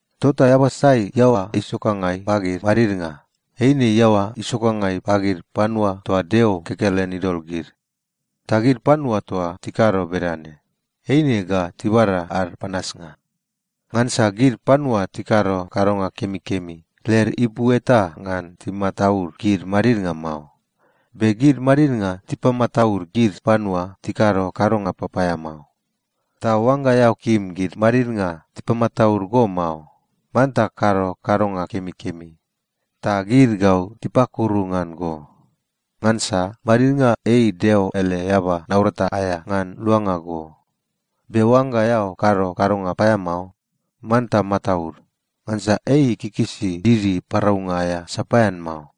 Tota eaba sai iaoa isokangai pagid madidnga, eine iaoa isokangai pagid panua toa Deo kekelen idol gid. Ta gid panua toa tikado bedane, eine ga tibada ad panasnga. Ngansa gid panua tikado kadonga kemikemi, led ipu eta ngan timataud gid madidnga mao. Be gid madidnga tipamataud gid panua tikado kadonga papaeamao. Ta oangga eao kim gid madidnga tipamataud go mao, manta kado kadonga kemikemi, ta gid ga tipakuru ngan go. Ngansa madidnga ei Deo ele eaba naurata aea ngan luanga go. Be oangga eao kado kadonga paeamao, manta mataud. Ngansa ei ikikisi didi paraunga aea sapaean mao.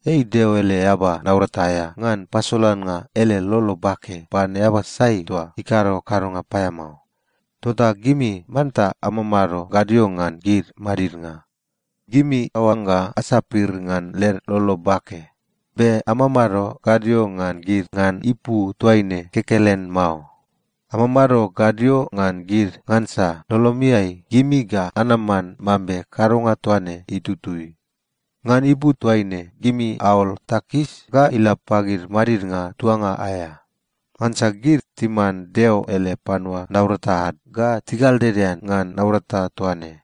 Ei Deo ele eaba naurata aea ngan pasolannga ele lolo bake pan eaba sai toa ikado kadonga paeamao. Tota gimi manta amamado gadio ngan gid madidnga. Gimi aoangga asapir ngan led lolo bake. Be amamado gadio ngan gid ngan ipu toaine kekelen mao. Amamado gadio ngan gid ngansa lolomiai, gimi ga anaman mambe kadonga toa ne itutui. Ngan ipu toaine gimi aol takis ga ila pagid madidnga tuanga aea. Ngansa gid timan Deo ele panua naurata ad ga tigaldedean ngan naurata toa ne.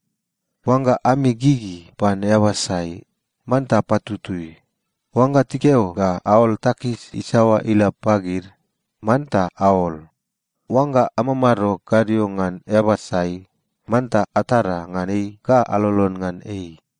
Oangga ami gigi pan eaba sai, manta apatutui. Oangga tikeo ga aol takis isaoa ila pagid, manta aol. Oangga amamado gadio ngan eaba sai, manta atada ngan ei ga alolon ngan ei.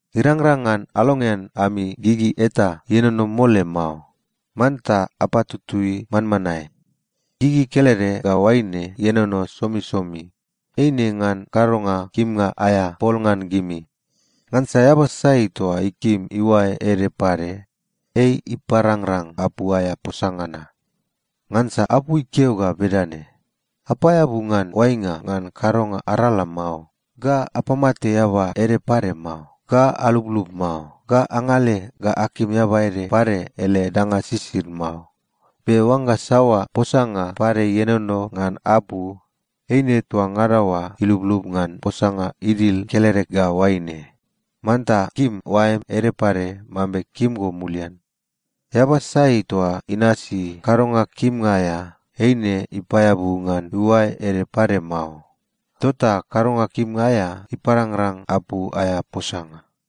Irangrang ngan alongean ami gigi eta ienono mole mao. Manta apatutui manmanae. Gigi kelede ga oaine ienono somisomi, eine ngan kadonga kimnga aea pol ngan gimi. Ngansa eaba sai toa ikim iuae ede pade, ei iparangrang apu aea posanga na. Ngansa apu ikeo ga bedane, “Apaeabu ngan oainga ngan kadonga arala mao,” ga “Apamate eaba ede pade mao,” ga “Alublub mao,” ga “Angale ga akim eaba ede pade ele danga sisid mao.” Be oangga saoa posanga pade ienono ngan apu, eine toa ngada oa iluplup ngan posanga idil kelede ga oaine, “Manta kim oaem ede pade mambe kim go mulian.” Eaba sai toa inasi kadonga kimnga aea, eine ipaeabu ngan iuae ede pade mao. Tota kadonga kimnga aea iparangrang apu aea posanga.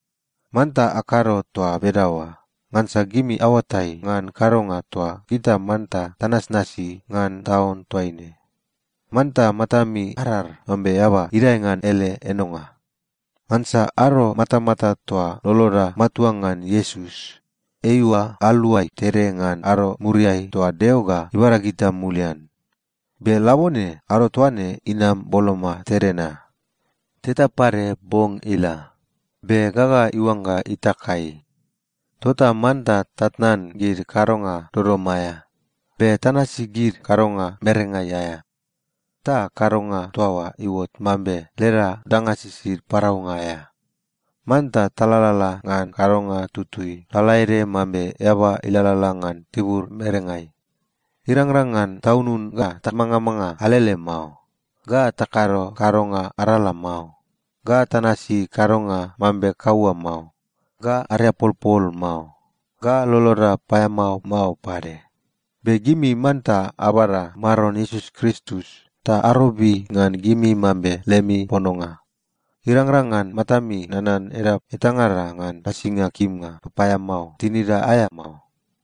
Manta akado toa bedaoa ngansa gimi aoatai ngan kadonga toa gita manta tanasnasi ngan taun toaine. Manta matami arar mambe eaba idae ngan ele enonga. Ngansa ado matamata toa loloda matua ngan Iesus, eiua aluai tede ngan ado muriai toa Deo ga ibada gita mulian. Be labone ado toa ne inam boloma tede na. Teta pade bong ila, be gaga iuangga itakai. Tota manta tatnan gid kadonga dodom aea. Be tanasi gid kadonga merengai aea, ta kadonga toa oa iuot mambe leda danga sisid paraunga aea. Manta talalala ngan kadonga tutui lalaede mambe eaba ilalala ngan tibur merengai. Irangrang ngan taunun ga tamangamanga alele mao, ga takado kadonga arala mao, ga tanasi kadonga mambe kaua mao, ga ariapolpol mao, ga loloda paeamao mao pade. Be gimi manta abada Maron Iesus Kristus ta arobi ngan gimi mambe lemi pononga. Irangrang ngan matami nanan edap etangada ngan nasinga kimnga papaeamao tinida aea mao.